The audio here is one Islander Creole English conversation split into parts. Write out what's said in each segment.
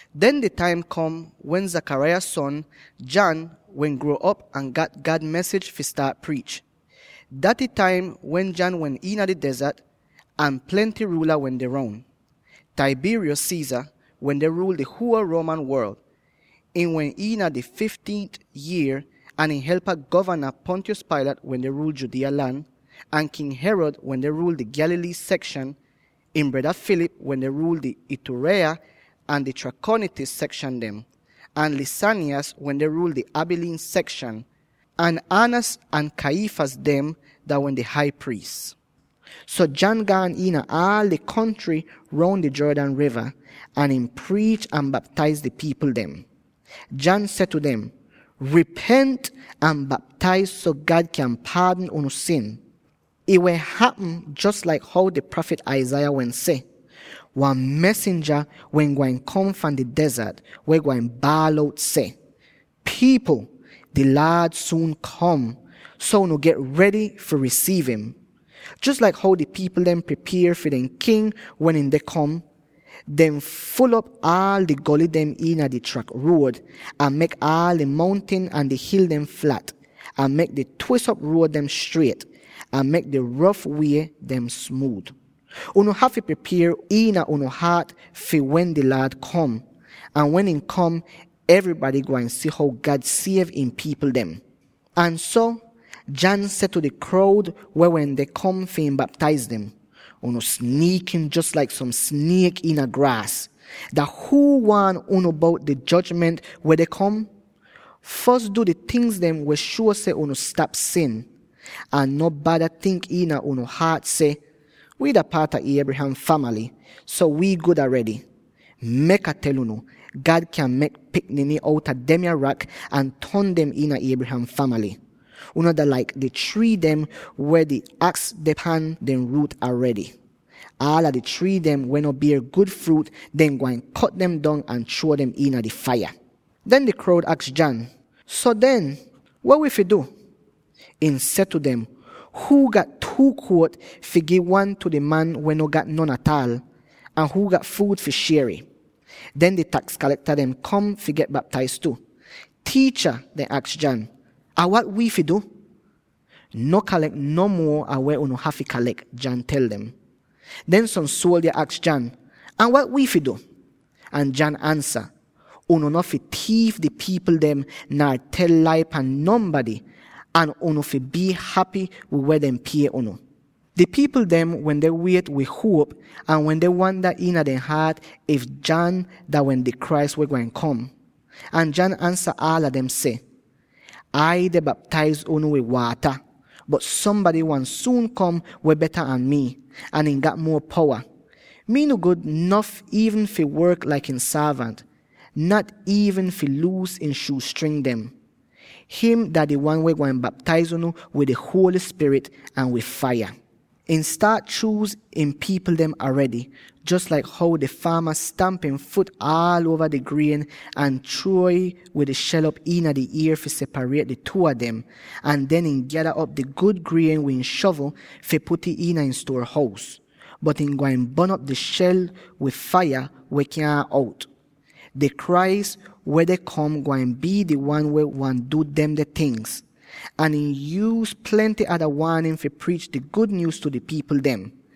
Den di taim kom wen Zechariah son, John, wehn gruo'op, ahn gat God mesij fi staat priich. Daty taim wen John wehn iina di dezart, ahn plenty ruula wende roun, Tiberius Caesar wende ruul di huol Roman worl —ihn wehn iina ihn fifteenth yier— ahn ihn helpa Govana Pontius Pilate wende ruul Judea lan, ahn King Herod wende ruul di Galilee sekshan, ihn breda Philip wende ruul di Ituraea ahn di Trachonitis sekshan dem, ahn Lysanias wende ruul di Abilene sekshan; ahn Annas ahn Caiaphas dehn dah wehn di Hai Priis. So, John gaan iina aal di kontry roun di Jordan riva, ahn ihn priich ahn baptaiz di pipl dem. John seh tu dem, “Ripent ahn baptaiz so God kyan paadn unu sin.” Ih wehn hapm jos laik how di prafit Isaiah wehn seh: “Wan mesinja wehn gwain kom fahn di dezart, weh gwain baal out seh: ‘Pipl! Di Laad suun kom, so unu get redy fi risiiv im! Jos laik how di pipl dem pripier fi dehn king wen ihn deh kom; dehn ful'op aal di goly dem iina di trak ruod, ahn mek aal di mountin ahn di hil dem flat, ahn mek di twis'op ruod dem striet, ahn mek di rof wiez dem smuud, unu hafy pripier iina unu haat fi wen di Laad kom.’ Ahn wen ihn kom, evrybady gwain si how God siev ihn pipl dem.” Ahn so, John seh tu di kroud weh wende kom fi ihn baptaiz dem, “Unu sniikin, jos laik som sniek iina graas! Dah huu waan unu bout di jojment weh deh kom? Fos du di tingz weh shuo seh unu stap sin. Ahn no bada tink iina unu haat seh, ‘Wii dah paat a Abraham famaly, so wi gud aredy!’ Mek Ah tel unu, God kyan mek pikniny outa demya rak ahn ton dem iina Abraham famaly! Unu dah laik di trii dem, weh di aks deh pan dehn ruut aredy. Aala di trii dem weh no bier gud fruut, dehn gwain kot dem dong ahn chruo dem iina di faiya.” Den di kroud aks John, “So den, weh wi fi du?” Ihn seh tu dem, “Huu gat two jakit, fi gi wan tu di man weh no gat non ataal, ahn huu gat fuud, fi shier'ih.” Den di taks kalekta dem kom fi get baptaiz tu. “Tiicha,” dehn aks John, “Ahn wat wi fi du?” “No kalek no muo an weh unu hafy kalek,” John tel dem. Den som suoldya aks John, “Ahn wat wi fi du?” Ahn John ansa, “Unu no fi tiif di pipl dem, nar tel lai pan nonbady ahn unu fi bii hapy wid weh dehn pie unu.” Di pipl wende wiet wid huop, ahn wende wanda iina dehn haat if John dah wehn di Christ weh gwain kom. Ahn John ansa aala dem seh, “Ai deh baptaiz unu wid waata, bot sombady gwain suun kom weh beta an mii, ahn ihn gat muo powa. Mii no gud nof iivn fi work laik ihn sorvant, nat iivn fi luus ihn shuuz string dem. Him dah di wan weh gwain baptaiz unu wid di Holy Spirit, ahn wid faiya. Ihn staat chuuz ihn pipl dem aredy, jos laik how di faama stamp ihn fut aal uova ihn grien ahn chruo'ih wid di shel op iina di ier fi separiet di two a dem, ahn den ihn gyada op di gud grien wid ihn shovl fi put'ih iina ihn stuor-hous; bot ihn gwain bon'op di shel wid faiya weh kyaahn out. Di Christ weh deh kom gwain bii di wan weh gwain du demde tingz.” Ahn ihn yuuz plenty ada waanin fi priich di gud nyuuz tu di pipl dem.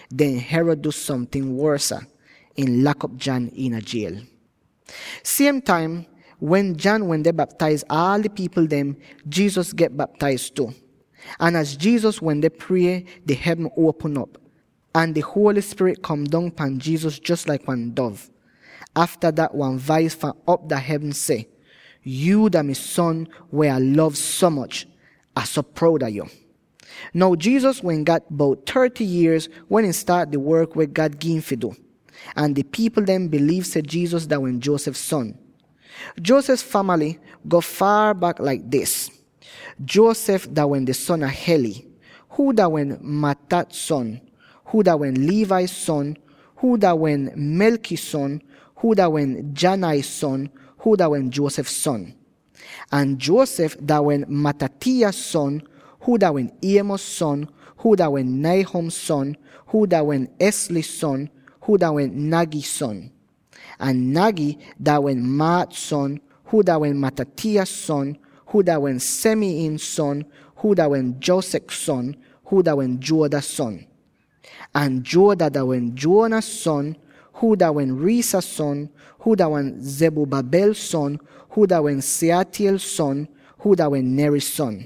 Den Herod du somting wosa: ihn lak'op John iina jiel. Siem taim wen John wende baptaiz aal di pipl dem, Jesus get baptaiz tu. Ahn az Jesus wende prie, di hevn uopm op, ahn di Holy Spirit kom dong pan Jesus jos laik wan dov. Afta dat wan vais fahn op iina hevn seh, “Yuu dah mi Son weh Ah lov so moch; Ah so proud a yo.” Now Jesus wehn gat bout thirty yierz wen ihn staat di work weh God gi'im fi du. Ahn di pipl dem biliiv seh Jesus dah wehn Joseph son. Joseph famaly go faar bak laik dis: Joseph dah wehn di son a Heli, huu dah wehn Matthat son, huu dah wehn Levi son, huu dah wehn Melchi son, huu dah wehn Jannai son, huu dah wehn Joseph son. Ahn Joseph dah wehn Mattathias son, huu dah wehn Amos son, huu dah wehn Nahum son, huu dah wehn Esli son, huu dah wehn Naggai son. Ahn Naggai dah wehn Maath son, huu dah wehn Mattathias son, huu dah wehn Semein son, huu dah wehn Josech son, huu dah wehn Joda son. Ahn Joda dah wehn Joanan son, huu dah wehn Rhesa son, huu dah wehn Zerubbabel son, huu dah wehn Shealtiel son, huu dah wehn Neri son.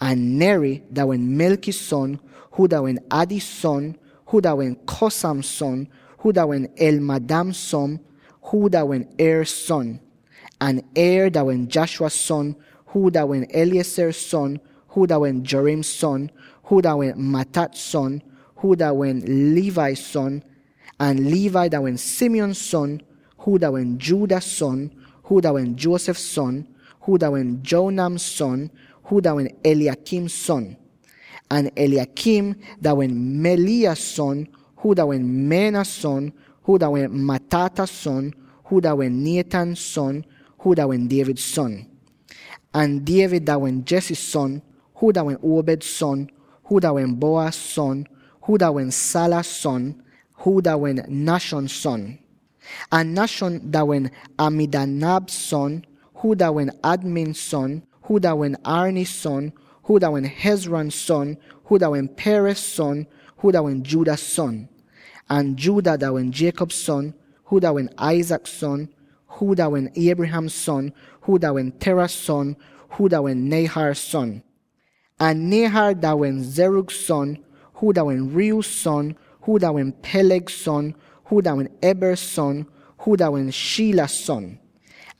Ahn Neri dah wehn Melchi son, huu dah wehn Addi son, huu dah wehn Cosam son, huu dah wehn Elmadam son, huu dah wehn Er son. Ahn Er dah wehn Joshua son, huu dah wehn Eliezer son, huu dah wehn Jorim son, huu dah wehn Matthat son, huu dah wehn Levi son. Ahn Levi dah wehn Simeon son, huu dah wehn Judah son, huu dah wehn Joseph son, huu dah wehn Jonam son, huu dah wehn Eliakim son. Ahn Eliakim dah wehn Melea son, huu dah wehn Menna son, huu dah wehn Mattatha son, huu dah wehn Nathan son, huu dah wehn David son. Ahn David dah wehn Jesse son, huu dah wehn Obed son, huu dah wehn Boaz son, huu dah wehn Sala son, huu dah wehn Nahshon son. Ahn Nahshon dah wehn Amminadab son, huu dah wehn Admin son, huu dah wehn Arni son, huu dah wehn Hezron son, huu dah wehn Perez son, huu dah wehn Judah son. Ahn Judah dah wehn Jacob son, huu dah wehn Isaac son, huu dah wehn Abraham son, huu dah wehn Terah son, huu dah wehn Nahor son. Ahn Nahor dah wehn Serug son, huu dah wehn Reu son, huu dah wehn Peleg son, huu dah wehn Eber son, huu dah wehn Shelah son.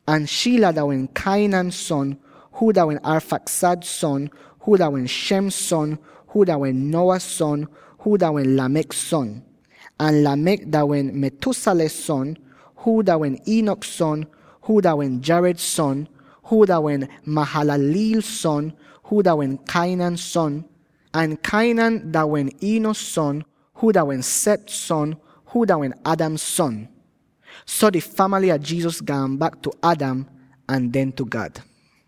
Ahn Shelah dah wehn Cainan son, huu dah wehn Arphaxad son, huu dah wehn Shem son, huu dah wehn Noah son, huu dah wehn Lamech son. Ahn Lamech dah wehn Methuselah son, huu dah wehn Enoch son, huu dah wehn Jared son, huu dah wehn Mahalaleel son, huu dah wehn Cainan son. Ahn Cainan dah wehn Enos son, huu dah wehn Seth son, huu dah wehn Adam son. So di famaly a Jesus gaan bak tu Adam, ahn den tu God.